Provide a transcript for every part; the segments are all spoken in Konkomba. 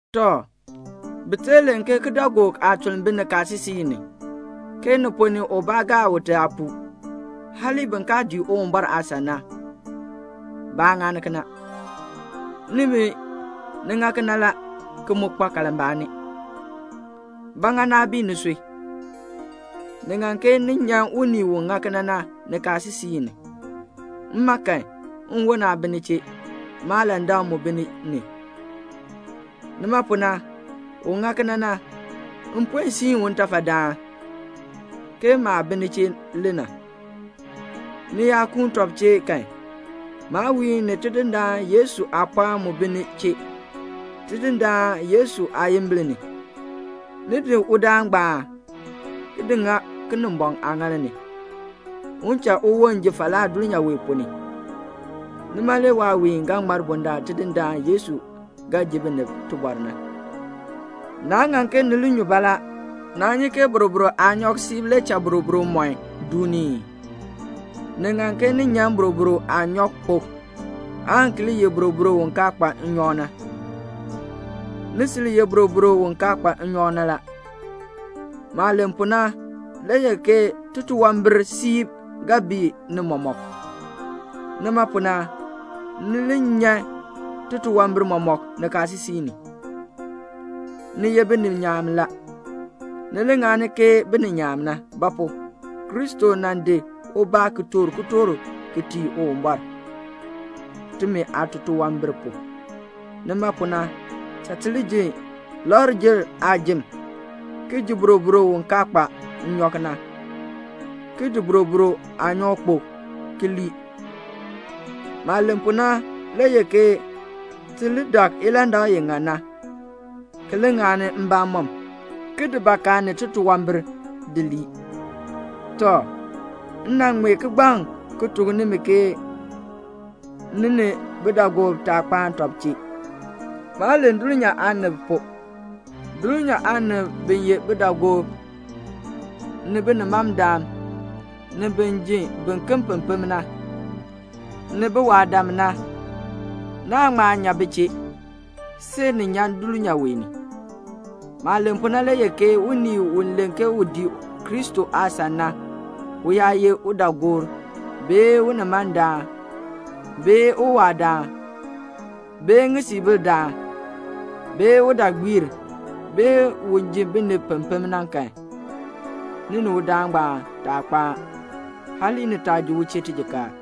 Tɔ, bi tee len ke kidaagook aatuln bi nikaasisik ni, ke ni ponn ni ubaa gaa ute aapuu. Hali bin kaa dii Uwumbɔr aasan na, baa ŋani kena. Nimi, ni ŋa kena la, ki mu kpa kalmbaani. Ba ŋa naa bii nisui? Ni ŋan ke ni nyan unii u ŋa kena na nikaasisik ni. Mma kan, nwon aa bi ni chee, maalandak mu bi ni ni. Nima pu na, un ŋa kena na, m puen siin u ntafadaan, ke maah bi ni chee le na. Ni yaa kuun tɔb chee kan, maawiin ni Tidindaan Yesu aapɔɔn mu bi ni chee, Tidindaan Yesu aayimbil ni, ni di udaan ngbaan di ŋa Kinimbɔŋ aaŋaal ni, un cha uwon ji falaa dulnyaa wee ponn ni. Nima le waawiin ga ŋmar bundaln Tidindaan Yesu ga ji binib tibɔr na. Naa ŋan ke ni li nyu baalaa. Naa nyi ke boroboro aanyɔk siib le cha boroboro mɔn duuni ii? Ni ŋan ke ni nyan boroboro aanyɔkpok, aan ki li ye boroboro u kaa kpa nnyɔk na. Ni sil ye boroboro u kaa kpa nnyɔk na la. Maah len pu na le ye ke titunwambir siib ga bii ni mɔmɔk. Nima pu na, ni li nyan titunwambir mɔmɔk nikaasisik ni. Ni ye bininyaan la. Ni li ŋani ke bininyaan na. Ba pu? Kristo nan di ubaa ki toor kitork ki tii Uwumbɔr, timi aatunwambir pu. Nima pu na, cha ti li ji Lakr-jer aajim, ki ji boroboro u kaa kpa nnyɔk na, ki di boroboro aanyɔkpok ki lii. Maah len pu na le ye ke ti li dak ilandak i ŋan na, ki li ŋani mbamɔm, ki di bakaa ni titunwambir di lii. Tɔ, m nan ŋmee kigbaŋ ki tuk nimi ke ni ni bidaagoob taa kpaan tɔb chee. Maa len dulnyaa aanib pu; dulnyaa aanib bi ye bidaagoob, ni binimandam, ni bin ji biken pempem na, ni biwaadam na, naa ŋma nyan bi chee, see ni nyan dulnyaa wee ni. Maah len pu na le ye ke unii u len ke u dii Kristo aasan na, u yaa ye udaagoor, bee unimandaan, bee uwaadaan, bee ŋisiibildaan, bee udaagbiir, bee un ji binib pempem na kan, ni ni udaan ngbaan taa kpaan. Hali ni taa ji u chee tijikaar.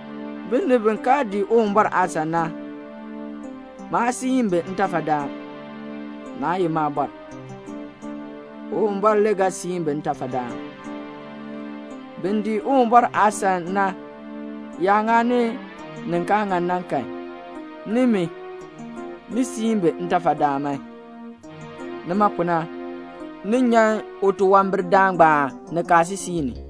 Binib bi kaa dii Uwumbɔr aasan na, maan siin bi ntafadaan. Naa ye maabɔr. Uwumbɔr le ga siin bi ntafadaan. Bin dii Uwumbɔr aasan na yaa ŋani ni kaa ŋan na kan, nimi, ni siin bi ntafadaan man. Nima pu na, ni nyan utunwambirdaan ngbaan nikaasisik ni.